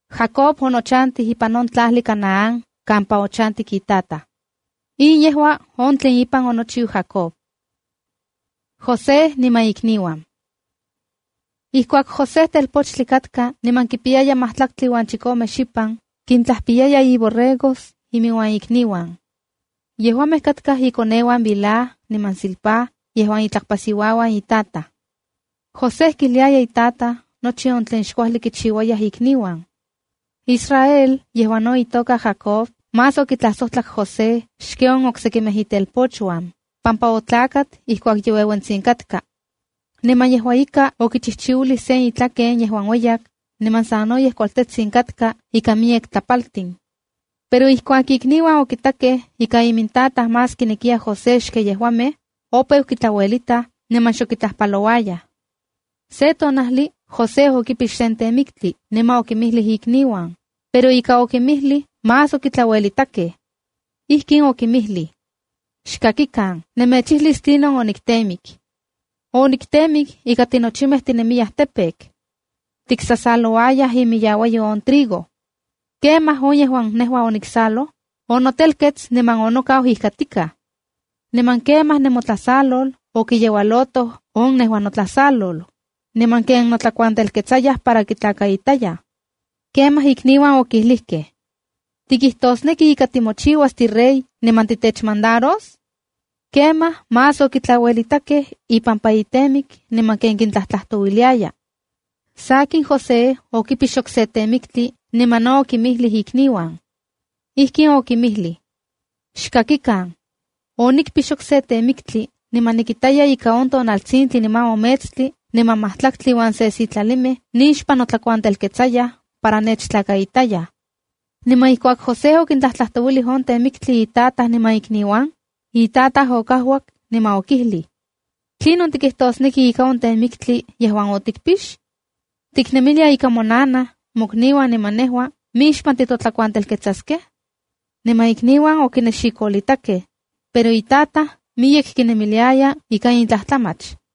Jacob onochantij ipan on tlajli Canaán kampa ochantik itataj. In yejua on tlen ipan onochiu Jacob. José niman ikniuan Ijkuak José, telpochtli katka niman kipiyaya matlatli uan chikome xipan, kintlajpiyaya borregos inmiuan ikniuan. Yejuamej katkaj inkoneuan Bilha niman Zilpá yejuan itlakpasiuauan itataj. José kijliaya itataj nochi on tlen xkuajli kichiuayaj ikniuan. Israel (yejuan no itoka Jacob) más okitlajsojtlak José xken on oksekimej itelpochuan, pampa otlakat ijkuak ye ueuentsitsin katka. Niman yejua ika okichijchiuilij sen itlaken yejuan ueyak, niman sanoyej kualtetsin katka ikan miyek tlapaltin. Pero ijkuak ikniuan okitakej ika imintataj más kinekiya José xken yejuamej, opeu kitlauelitaj, niman nion xok kitlajpalouayaj. Se tonajli José okipix sen temiktli niman okinmijlij ikniuan, pero ika okinmijtij más okitlauelitakej. Ijkin okinmijlij: —Xkakikan, nemechijlis tlinon oniktemik. Oniktemik ika tinochimej tinemiyaj campo. Tiksasalouayaj imiyauatlakyo on trigo. Kemaj on yejuan nejua oniksaloj, onotelkets niman onokau ijkatikaj. Niman kemaj nemotlasalol okiyeualotoj on nejua notlasalol, niman ken notlakuantelketsayaj para kitlakaitayaj. Kemaj ikniuan okilijkej: —¿Tikijtosneki ika timochiuas tirey niman titechmandaros? Kemaj más okitlauelitakej ipampa itemik niman ken kintlajtlajtouiliaya. Sakin, José okipix okse temiktli niman no okinmijlij ikniuan. Ijkin okinmijlij: —Xkakikan, onikpix okse temiktli, niman nikitaya ika on tonaltsintli niman on metstli niman majtlaktli uan se sitlalimej nixpan notlakuantelketsayaj para nechtlakaitayaj. Niman ijkuak José okintlajtlajtouilij on temiktli itataj niman ikniuan, itataj okajuak niman okijlij: —¿Tlinon tikijtosneki ika on temiktli yejuan otikpix? ¿Tiknemilia ika monanaj, mokniuan niman nejua mixpan titotlakuantelketsaskej? Niman ikniuan okinexikolitakej, pero itataj miyek kinemiliaya ika in tlajtlamach.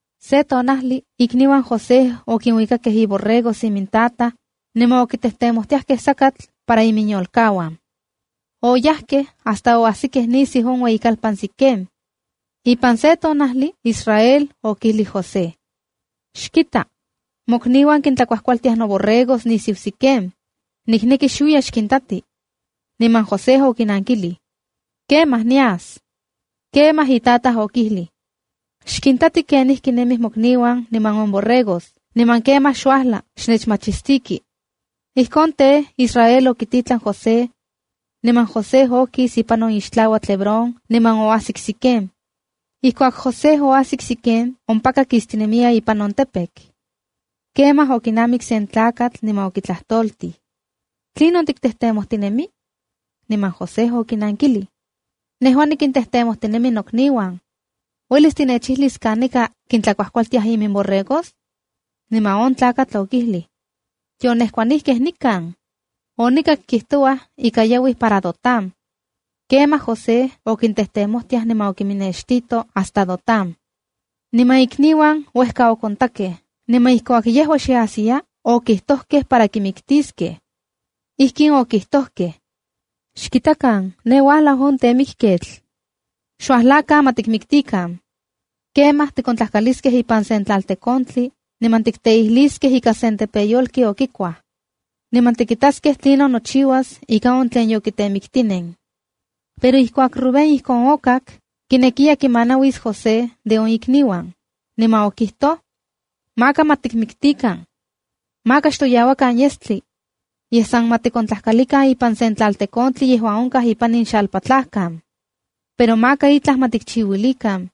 Se tonajli ikniuan José okinuikakej iborregos imintataj, niman okitejtemojtiajkej sakatl para iminyolkauan. Oyajkej hasta oajsikej nisiu on ueyikalpan Siquem. Ipan se tonajli Israel okijlij José: —Xkita, mokniuan kintlakuajkualtiaj noborregos nisiu Siquem. Nikneki xuiya xkintati. Niman José okinankilij: —¡Kemaj, niyas! Kemaj itataj okijlij: —Xkintati kenijkinemij mokniuan niman on borregos. Niman kemaj xuajla xnechmachistiki. Ijkon tej, Israel okititlan José. Niman José okis ipan on ixtlauatl Hebrón niman oajsik Siquem. Ijkuak José oajsik Siquem, ompaka kistinemiya ipan on campo. Kemaj okinamik sen tlakatl niman okitlajtoltij: —¿Tlinon tiktejtemojtinemi? Niman José okinankilij: —Nejua nikintejtemojtinemi nokniuan. ¿Uelis tinechijlis kanika kintlakuajkualtiaj iminborregos? Niman on tlakatl okijlij: —Yonejkuanijkej nikan. Onikak kijtouaj ika yauij para Dotán. Kemaj José okintejtemojtiaj niman okinnextito hasta Dotán. Niman ikniuan uejka okontakej, niman ijkuak yejua xe ajsiya, okijtokej para kimiktiskej. Ijkin okijtojkej: —¡Xkitakan, ne uajlau on temikketl! Xuajlakan, ma tikmiktikan. Kemaj tikontlajkaliskej ipan sen tlaltekontli niman tikteijliskej ika sen tepeyolki okikuaj. Niman tikitaskej tlinon nochiuas ika on tlen yokitemiktinen. Pero ijkuak Rubén ijkon okak, kinekiya kimanauis José de on ikniuan, niman okijtoj: —Maka ma tikmiktikan. Maka xtoyauakan yestli. Yej, san ma tikontlajkalikan ipan sen tlaltekontli yejuan onkaj ipan in xalpatlajkan. Pero maka itlaj ma tichiuilikan.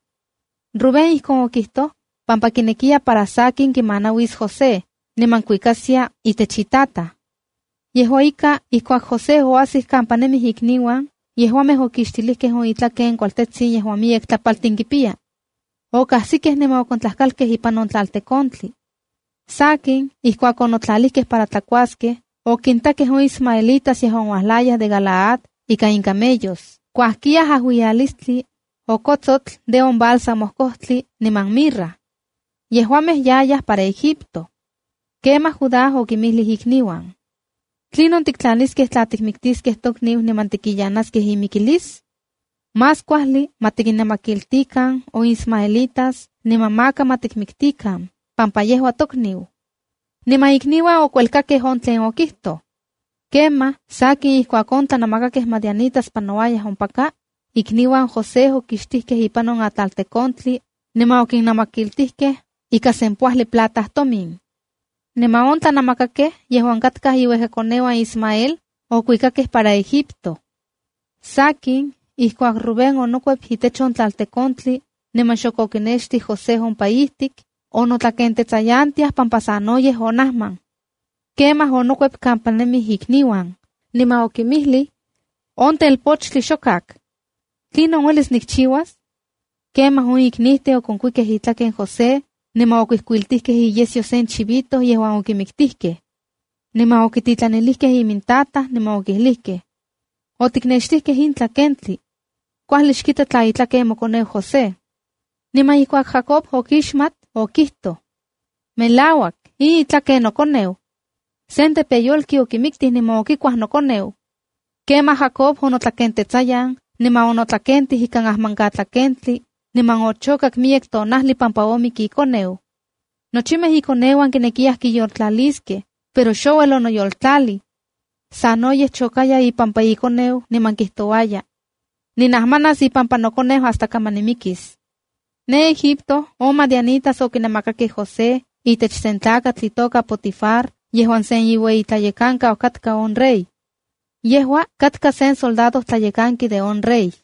Rubén ijkon okijtoj pampa kinekiya para sakin kimanauis José, niman kuikaskia itech itataj. Yejua ika, ijkuak José oajsik kampa nemij ikniuan, yejuamej okixtilijkej on itlaken kualtetsin yejuan miyek tlapaltin kipiyaya. Okajsikej niman okontlajkalkej ipan on tlaltekontli. Sakin, ijkuak onotlalijkej para tlakuaskej, okintakej on ismaelitas yejuan uajlayaj de Galaad ika incamellos kuajkiyaj ajuiyalistli, okotsotl de on bálsamo kojtli niman mirra. Yejuamej yayaj para Egipto. Kemaj Judá okinmijlij ikniuan: —¿Tlinon tiktlaniskej tla tikmiktiskej tokniu niman tikiyanaskej imikilis? Más kuajli ma tikinnamakiltikan on ismaelitas niman maka ma tikmiktikan, pampa yejua tokniu. Niman ikniuan okuelkakkej on tlen okijtoj. Kemaj, sakin ijkuak on tlanamakakej Madianitas panouayaj ompaka, ikniuan José okixtijkej ipan on tlaltekontli, niman okinnamakiltijkej ika sempoajli plata tomin. Niman on tlanamakakej, yejuan katkaj iuejkakoneuan Ismael, okuikakej para Egipto. Sakin, ijkuak Rubén onokuep itech on tlaltekontli niman xok okinextij José ompa ijtik, onotlakentetsayantiaj pampa sanoyej onajman. Kemaj onokuep kampa nemij ikniuan, niman okinmijlij: —¡On telpochtli xokak! ¿Tlinon uelis nikchiuas? Kemaj on iknijtin okonkuikej itlaken José niman okuijkuiltijkej iyesyo sen chivito yejuan okimiktijkej. Niman okititlanilijkej imintataj niman okijlijkej: “Otiknextijkej in tlakentli. Kuajli xkita tla itlaken mokoneu José.” Niman ijkuak Jacob okixmat, okijtoj: “¡Melauak, yejua in itlaken nokoneu! Sen tepeyolki okimiktij niman okikuaj nokoneu.” Kemaj Jacob onotlakentetsayan, niman onotlakentij ikan ajmankatlakentli, niman ochokak miyek tonajli pampa omik ikoneu. Nochimej ikoneuan kinekiyaj kiyoltlaliskej, pero xouel onoyoltlalij. Sanoyej chokaya ipampa ikoneu niman kijtouaya: “Ninajmanas ipampa nokoneu hasta kaman nimikis.” Ne Egipto on madianitas tlakamej okinamakakej José itech sen tlakatl itoka Potifar yejuan sen iueyitlayekankau katka on rey. Yejua katka sen soldadojtlayekanki de isoldados on rey.